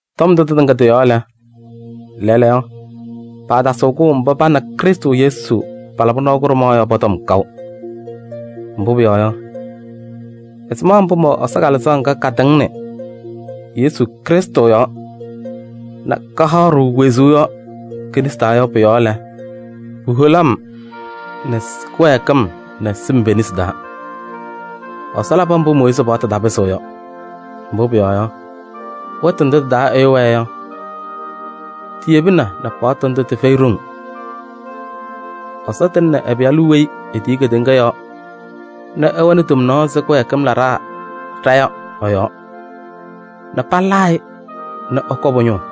Tɔm ndʋ tɩtɩŋa tɩ-yɔɔ lɛ, lɛɛlɛɛyɔ paatasɩɣ kʋʋ mba pa nɛ Krɩstʋ Yesu palabɩ nɔɔ kʋɖʋmaɣ yɔ pɔ-tɔm kaʋ. Mbʋ pʋyɔɔ yɔ, ɛzɩma mbʋ mɛwɛ Ɛsɔ Kalɩzaɣ ŋga katɩŋnɩ Krɩstʋ Yesʋ yɔɔ nɛ kahaɣ-ɖʋ wezuu yɔ ke-nesi taa yɔ pʋ-yɔɔ lɛ, puholi-m nɛ kɩwɛɛkɩm nɛ sɩm pe-nesi taa. Ɛsɔ labɩ mbʋ Mooyiizi paɣtʋ tapɩzɩɣ yɔ. Mbʋ pʋyɔɔ yɔ, wɛtʋ ndʋ tɩ-taa ɛyʋ wɛɛ yɔ, tiyebina nɛ paɣtʋ ndʋ tɩfɛyɩ ɖoŋ: Ɛsɔ tɩŋnɩ ɛ-Pɩyalʋ weyi etiyi kedeŋa yɔɔ nɛ ɛwɛnɩ tomnaɣ ɛzɩ kɩwɛɛkɩm laɖaa ɖa yɔ ɛ-yɔɔ nɛ palaa-ɩ nɛ ɛkɔ pʋ-ñʋʋ.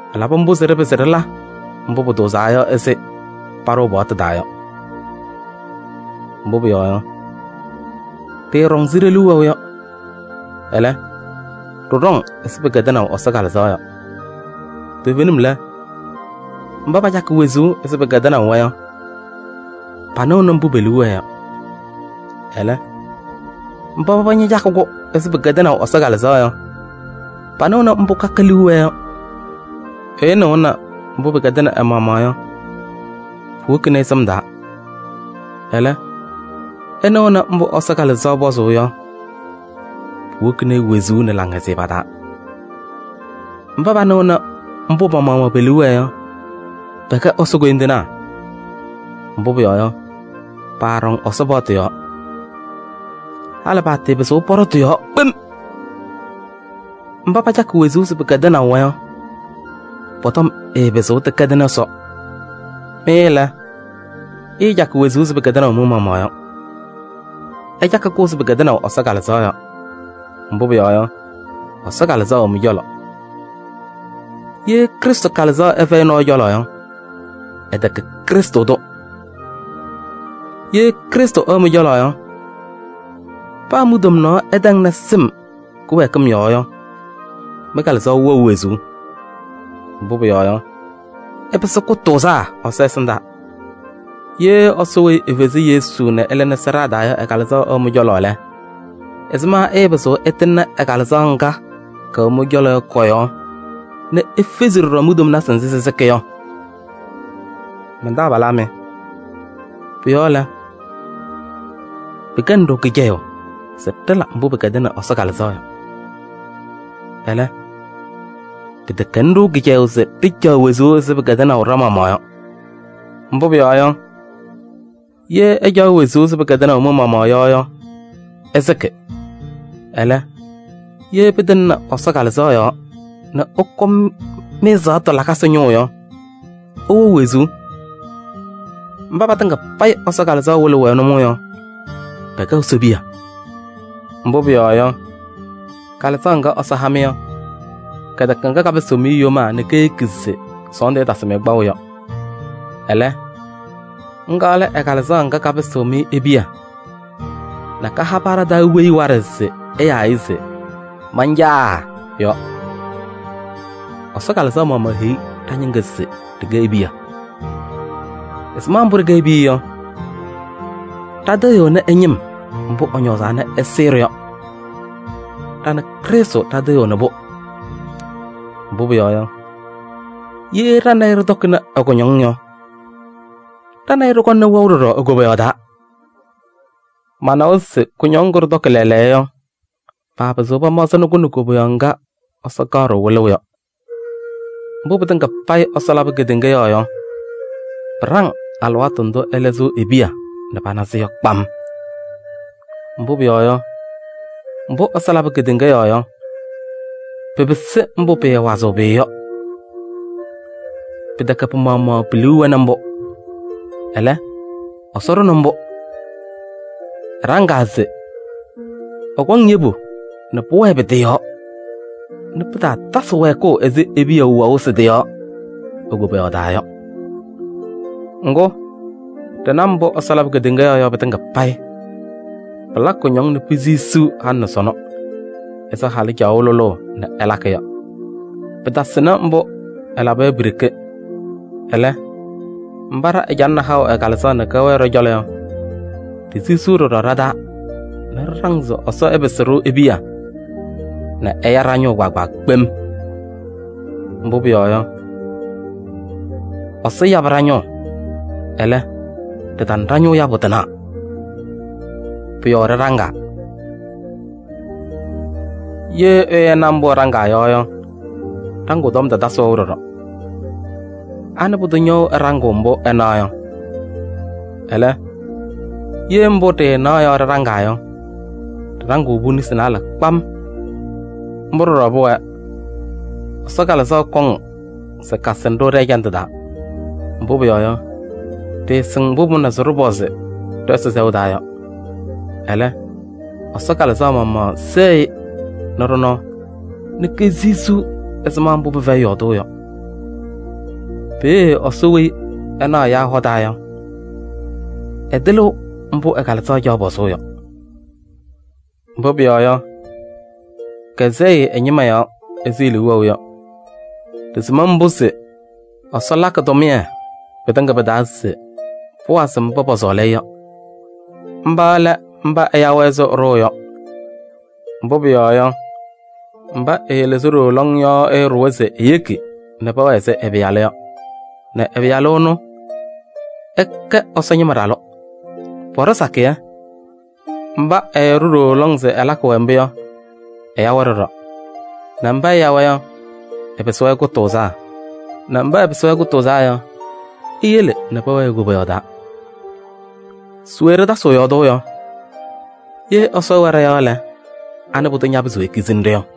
Ɛlabɩ mbʋ se ɖɩpɩzɩ ɖɩla mbʋ pʋtʋʋzaa yɔ ɛzɩ paɖʋʋ paɣtʋ taa yɔ. Mbʋ pʋyɔɔ yɔ, ɖɩɩɖɔŋ ɛzɩ ɖe-liu wɛʋ yɔ. Ɛlɛ, ɖɩɖɔŋ ɛzɩ pɩkɛdɩnaʋ Ɛsɔ Kalɩzaɣ yɔ. Toovenim lɛ, mba pacakɩ wezuu ɛzɩ pɩkɛdɩnaʋ-wɛ yɔ, panɩɣnɩ mbʋ pe-liu wɛɛ yɔ. Ɛlɛ, mba paba ñacakɩ-kʋ ɛzɩ pɩkɛdɩnaʋ Ɛsɔ Kalɩzaɣ yɔ, panɩɣnɩ mbʋ kaka liu wɛɛ yɔ. Ɛyʋ nɩɣʋnɩ mbʋ pɩkɛdɩnɩ ɛ-maɣmaɣ yɔ, puwokini-i sɩm taa. Ɛlɛ, ɛnɩɣʋnɩ mbʋ Ɛsɔ Kalɩzaɣ pɔzʋʋ yɔ, puwokini-i wezuu nɛ laŋhɛzɩyɛ pa-taa. Mba panɩɣnɩ mbʋ pa-maɣmaɣ pe-liu wɛɛ yɔ, pɛkɛ Ɛsɔ koyindinaa. Mbʋ pʋyɔɔ yɔ, paaɖɔŋ Ɛsɔ paɣtʋ yɔɔ. Halɩ paatɩɩpɩzɩɣ pɔɖɔ tɩ-yɔɔ kpem. Mba pacakɩ wezuu ɛzɩ pɩkɛdɩnaʋ-wɛ yɔ, pɔ-tɔm ɛɛpɩzɩɣ tɩkɛdɩnɩ Ɛsɔ. Mɩ lɛ, ɩɩcakɩ wezuu ɛzɩ pɩkɛdɩnaʋ mɩ-maɣmaɣ yɔ, ɩcakɩ-kʋ ɛzɩ pɩkɛdɩnaʋ Ɛsɔ Kalɩzaɣ yɔ. Mbʋ pʋyɔɔ yɔ, Ɛsɔ Kalɩzaɣ wɛ mɩ-cɔlɔ. Ye Krɩstʋ Kalɩzaɣ ɛfɛyɩ nɔɔyʋ cɔlɔ yɔ, ɛtɛkɛ Krɩstʋ tʋ. Ye Krɩstʋ ɛwɛ mɩ-cɔlɔ yɔ, paa mi-tomnaɣ ɛtɛŋnɩ sɩm kɩwɛɛkɩm yɔɔ yɔ, mɩ-kalɩzaɣ wɛɣ wezuu. Mbʋ pʋyɔɔ yɔ, ɩpɩsɩ kʋtʋʋzaa Ɛsɔ ɛsɩndaa. Ye Ɛsɔ weyi efezi Yesu nɛ ɛlɩnɩ sɩɖaa taa yɔ ɛ-Kalɩzaɣ ɛwɛ mɩ-cɔlɔ lɛ, ɛzɩma ɛɛpɩzɩɣ ɛtɩŋnɩ ɛ-Kalɩzaɣ ŋga kɛwɛ mɩ-cɔlɔ yɔ kɔ-yɔɔ nɛ efezi ɖɔɖɔ mi-tomnasɩ nzɩ sɩsɩkɩ yɔ? Man-taabalaa mɩ, pʋ-yɔɔ lɛ, pɩkɛnɩ-ɖʋ kɩcɛyʋʋ se ɖɩla mbʋ pɩkɛdɩnɩ Ɛsɔ Kalɩzaɣ yɔ. Ɛlɛ, pɩtɛkɛnɩ-ɖʋ kɩcɛyʋʋ se ɖɩcaɣ wezuu ɛzɩ pɩkɛdɩnaʋ ɖa-maɣmaɣ yɔ. Mbʋ pʋyɔɔ yɔ, ye ɩcaɣ wezuu ɛzɩ pɩkɛdɩnaʋ mɩ-maɣmaɣ yɔ yɔ, ɩsɩkɩ. Ɛlɛ, ye pɩtɩŋnɩ Ɛsɔ Kalɩzaɣ yɔɔ nɛ ɩkɔ mɩ-ɛzaɣtʋ lakasɩ ñʋʋ yɔ, ɩwɛɣ wezuu. Mba patɩŋa payɩ Ɛsɔ Kalɩzaɣ wɩlɩɣ-wɛ nʋmɔʋ yɔ, pɛkɛ Ɛsɔ piya. Mbʋ pʋyɔɔ yɔ, Kalɩzaɣ ŋga Ɛsɔ ha-mɩ yɔ, kɛtɛkɛ ŋga kapɩsɩɣ-mɩ yomaa nɛ keyeki se sɔɔndʋ ɛtasɩ-mɩ kpaʋ yɔ. Ɛlɛ, ŋga lɛ ɛ-Kalɩzaɣ ŋga kapɩsɩɣ-mɩ e-piya nɛ kaha paa ɖa-taa weyi waɖɛ se ɛyaa-ɩ se: “Man-Caa!” yɔ. Ɛsɔ Kalɩzaɣ maɣmaɣ heyi ɖa-ñɩŋga se ɖɩkɛ e-piya. Ɛzɩma mbʋ ɖɩkɛ e-piya yɔ, ɖatɩɣyɩɣnɩ ɛ-ñɩm mbʋ ɛñɔɔzaa nɛ ɛsɩɩ-ɖʋ yɔ. Ɖa nɛ Krɩstʋ ɖɩtɩɣyɩɣnɩ-pʋ. Mbʋ pʋyɔɔ yɔ, ye ɖa nɛ ɩ ɖɩtɔkɩnɩ ɛ-kʋñɔŋ yɔ, ɖa nɛ ɩ ɖɩkɔŋnɩ wɛʋ ɖɔɖɔ e-koboyaɣ taa. Manawa se kʋñɔŋ ŋgʋ ɖɩtɔkɩ lɛɛlɛɛyɔ yɔ, paapɩzɩɣ pamaɣzɩnɩ-kʋ nɛ koboyaɣ ŋga Ɛsɔ kaɣ-ɖʋ wɩlʋʋ yɔ. Mbʋ pɩtɩŋa payɩ Ɛsɔ labɩ kedeŋa yɔɔ yɔ, pɩɖaŋ alɩwaatʋ ndʋ Ɛsɔ lɩzɩɣ e-piya nɛ pana-sɩ yɔ kpam. Mbʋ pʋyɔɔ yɔ, mbʋ Ɛsɔ labɩ kedeŋa yɔɔ yɔ, pɩpɩsɩ mbʋ pɩɩwazɩɣ pʋyʋ yɔ. Pɩtɛkɛ pɩ-maɣmaɣ pi-liu wɛnɩ mbʋ, ɛlɛ, Ɛsɔ ɖʋnɩ-pʋ mbʋ. Ɛɖaŋaa se: ɛkɔŋ yebu nɛ pʋwɛɛ pɩ-tɩ yɔɔ nɛ pɩtaatasɩ wɛɛkʋʋ ɛzɩ e-piya wɛʋ sɩ-tɩ yɔɔ e-koboyaɣ taa yɔ. Ŋgʋ, ɖɩna mbʋ Ɛsɔ labɩ kedeŋa yɔɔ yɔ pɩtɩŋa payɩ, pɩlakɩ kʋñɔŋ nɛ pisisiɣ halɩ nɛ sɔnɔ ɛzɩ halʋ caɣʋ lʋlʋʋ nɛ ɛlakɩ yɔ. Pɩtasɩnɩ mbʋ ɛlaba yɔ pi-ɖeke. Ɛlɛ, mba ɖa ɛcalɩnɩ haʋ ɛ-Kalɩzaɣ nɛ kɛwɛɛ ɖɔ-cɔlɔ yɔ, ɖisisiɣ ɖɔɖɔ ɖa-taa nɛ ɖɩɖaŋ se Ɛsɔ ɛpɩsɩ-ɖʋ e-piya nɛ ɛya ɖa-ñʋʋ kpaagbaa kpem. Mbʋ pʋyɔɔ yɔ, Ɛsɔ yabɩ ɖa-ñʋʋ, ɛlɛ, ɖɩtana ɖa-ñʋʋ yabʋ tɩnaɣ. Pʋ-yɔɔ ɖɩɖaŋaa. Ye ɛyʋ ɛna mbʋ ɛɖaŋaa yɔ yɔ, ɖaŋʋʋ tɔm tatasɩ wɛʋ ɖɔɖɔ: anɩ pʋdʋ ñɛwɛɣ ɛɖaŋɩɣ mbʋ ɛnaɣ yɔ? Ɛlɛ, ye mbʋ ɖɩɩnaɣ yɔ ɖɩɖaŋaa yɔ, ɖɩɖaŋɩɣ-pʋ nesi naalɛ kpam. Mbʋ ɖɔɖɔ pʋwɛɛ, Ɛsɔ Kalɩzaɣ kɔŋ se kasɩnɩ-ɖʋ ɖɛ-ɛjandʋ taa. Mbʋ pʋyɔɔ yɔ, ɖɩɩsɩŋ mbʋ pʋmʋnaa se ɖɩpɔzɩ ɖɛ-Ɛsɔ sɛʋ taa yɔ. Ɛlɛ, Ɛsɔ Kalɩzaɣ maɣmaɣ sɛɣ-ɩ nɛ ɖɔ-nɔɔ nɛ kesisiɣ ɛzɩma mbʋ pɩfɛyɩ yɔɔdʋʋ yɔ. Peeye Ɛsɔ weyi ɛnaɣ ɛyaa hɔ taa yɔ, ɛtɩlɩɣ mbʋ ɛ-Kalɩzaɣ caɣ pɔzʋʋ yɔ. Mbʋ pʋyɔɔ yɔ, kɛsɛɣ-ɩ ɛ-ñɩma yɔɔ ɛzɩ e-liu wɛʋ yɔ. Ɖɩsɩm mbʋ se Ɛsɔ lakɩ tʋmɩyɛ pɩtɩŋa pɩ-taa se pʋwazɩ mba pɔsɔɔlɩ-ɩ yɔ. Mba lɛ mba ɛya-wɛ ɛzɩ ɛɖʋʋ yɔ. Mbʋ pʋyɔɔ yɔ, mba ɛɛlɩzɩ ɖooo lɔŋ yɔ ɛɛɖʋwa se eyeki nɛ pɛwɛɛ ɛzɩ ɛ-Pɩyalʋ yɔ, nɛ ɛ-Pɩyalʋ ɛnʋ, ɛkɛ Ɛsɔ ñɩma ɖalʋ. Pɔɖɔ sakɩyɛ. Mba ɛɛɖʋ ɖooo lɔŋ se ɛlakɩ-wɛ mbʋ yɔ, ɛya-wɛ ɖɔɖɔ, nɛ mba ɛya-wɛ yɔ, ɛpɩsɩ-wɛ kʋtʋʋzaa, nɛ mba ɛpɩsɩ-wɛ kʋtʋʋzaa yɔ, eyele nɛ pɛwɛɛ e-Koboyaɣ taa. Se we ɖɩtasɩɣ yɔɔdʋʋ yɔ? Ye Ɛsɔ ɛwɛ ɖɔ-yɔɔ lɛ, anɩ pʋdʋ ñapɩzɩɣ ekizini-ɖʋ yɔ?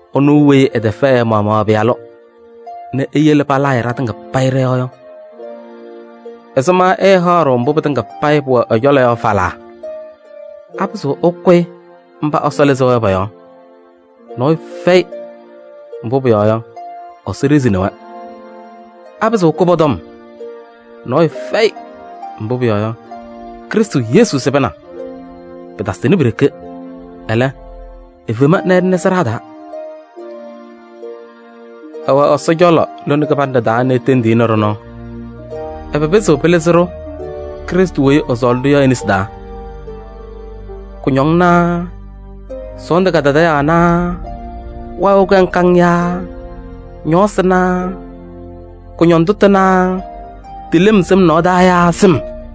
Ɛnʋ weyi ɛtɛfɛɛ ɛ-maɣmaɣ ɛ-Pɩyalʋ nɛ eyele palaa-ɩ ɖatɩŋa payɩ ɖɔ-yɔɔ yɔ, ɛzɩma ɛɛhaɣ-ɖʋ mbʋ pɩtɩŋa payɩ pʋwɛ ɛ-cɔlɔ yɔ falaa? Apɩzɩɣ ɛkʋyɩ mba Ɛsɔ lɩzaa yɔ pɔ-yɔɔ? Nɔɔyʋ fɛyɩ, mbʋ pʋyɔɔ yɔ, Ɛsɔ ɖezini-wɛ. Apɩzɩɣ ɛkʋ pɔ-tɔm? Nɔɔyʋ fɛyɩ, mbʋ pʋyɔɔ yɔ, Krɩstʋ Yesu sɩbɩna. Pɩtasɩnɩ pi-ɖeke, ɛlɛ, efema nɛ ɛlɩnɩ sɩɖaa taa. Ɛwɛ Ɛsɔ cɔlɔ lone kɩbanɖɛ taa nɛ etendiɣ-i nɛ ɖɔ-nɔɔ. Ɛbɛ pɩzɩɣ pɩlɩzɩ-ɖʋ Krɩstʋ weyi ɛsɔɔlɩ-ɖʋ yɔ e-nesi taa? Kʋñɔŋ naa sɔɔndʋ kadadaɣyaɣ naa wayɩ wɛʋ kaŋ kaŋ naa ñɔɔsɩ naa kʋñɔndʋ tʋ naa tɩ lem sɩm nɔɔ taa yaa sɩm?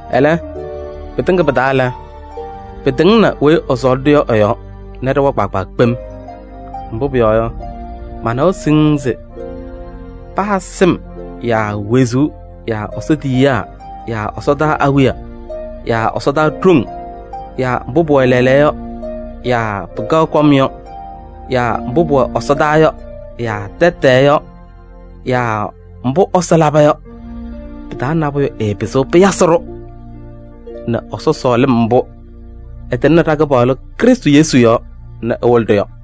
Ɛlɛ, pɩtɩŋa payɩ pɩ-taa lɛ, pɩtɩŋnɩ weyi ɛsɔɔlɩ-ɖʋ yɔ ɛ-yɔɔ nɛ ɖɩwa kpaagbaa kpem. Mbʋ pʋyɔɔ yɔ, manawa siŋŋ se: paa sɩm yaa wezuu yaa Ɛsɔ tiyiyaa yaa ɛsɔdaa awiya yaa ɛsɔdaa ɖoŋ yaa mbʋ pʋwɛ lɛɛlɛɛyɔ yaa pɩkaɣ kɔm yɔ yaa mbʋ pʋwɛ ɛsɔdaa yaa tɛtɛɛ yɔ yaa mbʋ Ɛsɔ laba yɔ pɩ-taa nabʋyʋ ɛɛpɩzɩɣ pɩyasɩ-ɖʋ nɛ Ɛsɔ sɔɔlɩm mbʋ ɛtɩŋnɩ ɖa-Kɩpaɣlʋ Krɩstʋ Yesu yɔɔ nɛ ɛwɩlɩ-ɖʋ yɔ.